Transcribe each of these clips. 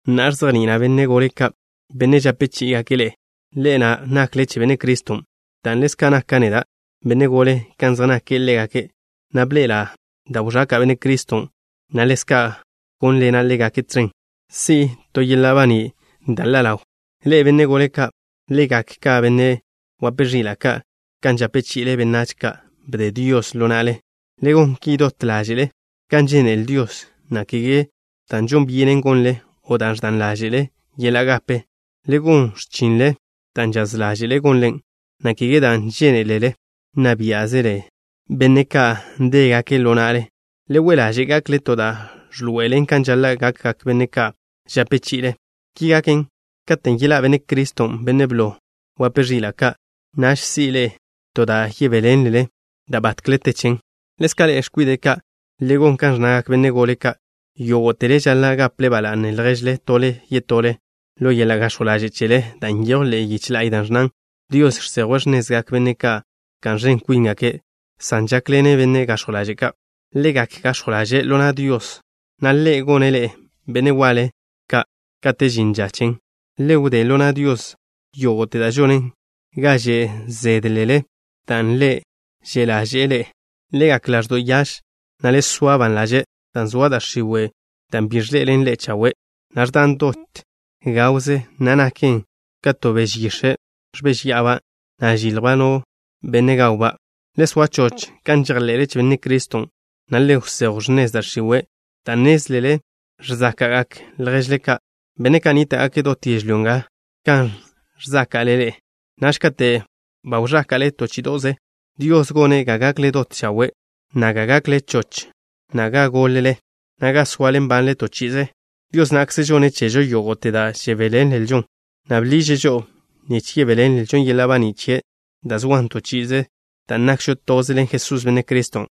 Na'a, ẕzejni'ila' benne' gole ka', benne' žape chí'igake' ḻe'e, ḻe'e na' nakle che Benne' Criston', dan' ḻezka' naka' neda' benne' gole kan zej nake' ḻégake', na' bḻe'ela' da' wẕaka' Benne' Criston', na' ḻezka' gónḻena' ḻégake' tẕen, si'to' yeḻa' baní' da' ḻa' ḻawn. Ḻe'e, benne' gole ka', le gak ka benne' wape ẕila' ka' kan žape chi'ile benách ka' bde Dios ḻo na'le. Le gon ki dot ḻáže'le kan žénele Dios, na' kege dan' žon byenen gonlen, o dan' ẕdan ḻáže'le yeḻa' gape. Le gon x̱chinle dan' žaz ḻáže'le gonlen, na' kege dan' žénelele nna biá'zele benne' ka' ndégake' ḻo na'le. Le we' ḻaže' gakle to da' ẕḻoe'elen kan žaḻa' gakgak benne' ka' žape chi'ile. Ki gaken, katen' yeḻá' Benne' Criston', Bennen' blo wape ẕila' ka', naž si'le to da' yebéḻenlelen da' batkle te chen. Ḻezka' ḻe'e, x̱kwide' ka', le gon kan ẕnnagak benne' gole ka'. Yógo'tele žaḻa' gaple ba la'ne lježle, tole yetole, ḻo yeḻa' gax̱jw ḻaže' chele, dan' nyejw ḻe'e yiche la'y da' ẕnnan: Dios žsejwe' x̱nezgak benne' ka' ẕka'n ẕen kwíngake' san žákḻene' benne' gax̱jw ḻaže' ka'. Le gak gax̱jw ḻaže' ḻo na' Dios, na' Ḻe' gone' ḻe'e benne' waḻe ka' kate' žin ža chen. Le wdé ḻo na' Dios yógo'te da' žonen ga že' zédelele dan' Ḻe' že' ḻaže'e ḻe'e. Le gak ḻaẕdo' yaž, na' le soa ban ḻaže', dan' zoa da' x̱iwe', dan' bi ẕḻe'elen ḻe'e chawe', na' ẕdan dot gawze, na' naken ka to beže yix̱e' ẕbéžya'aba', na' žiljba' no benne' gawba'. Le soa choch kan žejḻe'le che Benne' Criston', na' le wsejw x̱nez da' x̱iwe', dan' nnézlele ẕzáka'gak lježle ka', benne' ka' nníta'gake' dot yežlyó nga, kan ẕzáka'le ḻe'e. Naž kate' ba wẕáka'le to chí'ido'ze, Dios gone' ga gakle dot chawe', na' ga gakle choch, na' ga gólele, na' ga soale nbanle to chi'ize. Dios na'kze žonne' chežo yógo'te da' žebéḻenlžon, na' bḻiže' žo'o nich yebéḻenlžo yeḻa' baní' chie' da' zoan to chi'ize, dan' nakžo toze ḻen Jesús, Benne' Criston'.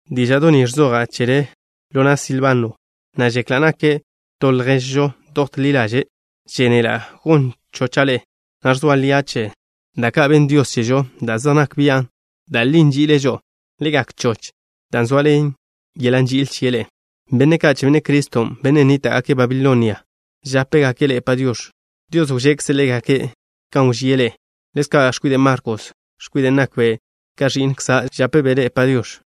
Díža'do' ni ẕzoja' chele ḻo na' Silbano, na' žekla' nake' to lježžo dot ḻi ḻaže'. Žénela' gon chocha' ḻe'e, na' ẕzoa lia' che da' ka' benn Dios chežo, da' zej nak bian' da' li nži'ile' žo'o. Le gak choch dan' zoaḻen yeḻa' nži'il chie' ḻe'e. Benne' ka' che Benne' Criston', benne' nníta'gake' Babilonia, žápegake' ḻe'e “Padiox̱.” Dios wžekze' ḻégake' kan wžíe' ḻe'e. Ḻezka' x̱kwide' Markos, x̱kwiden' nakbe' ka ẕi'nkza', žapbe' ḻe'e “Padiox̱.”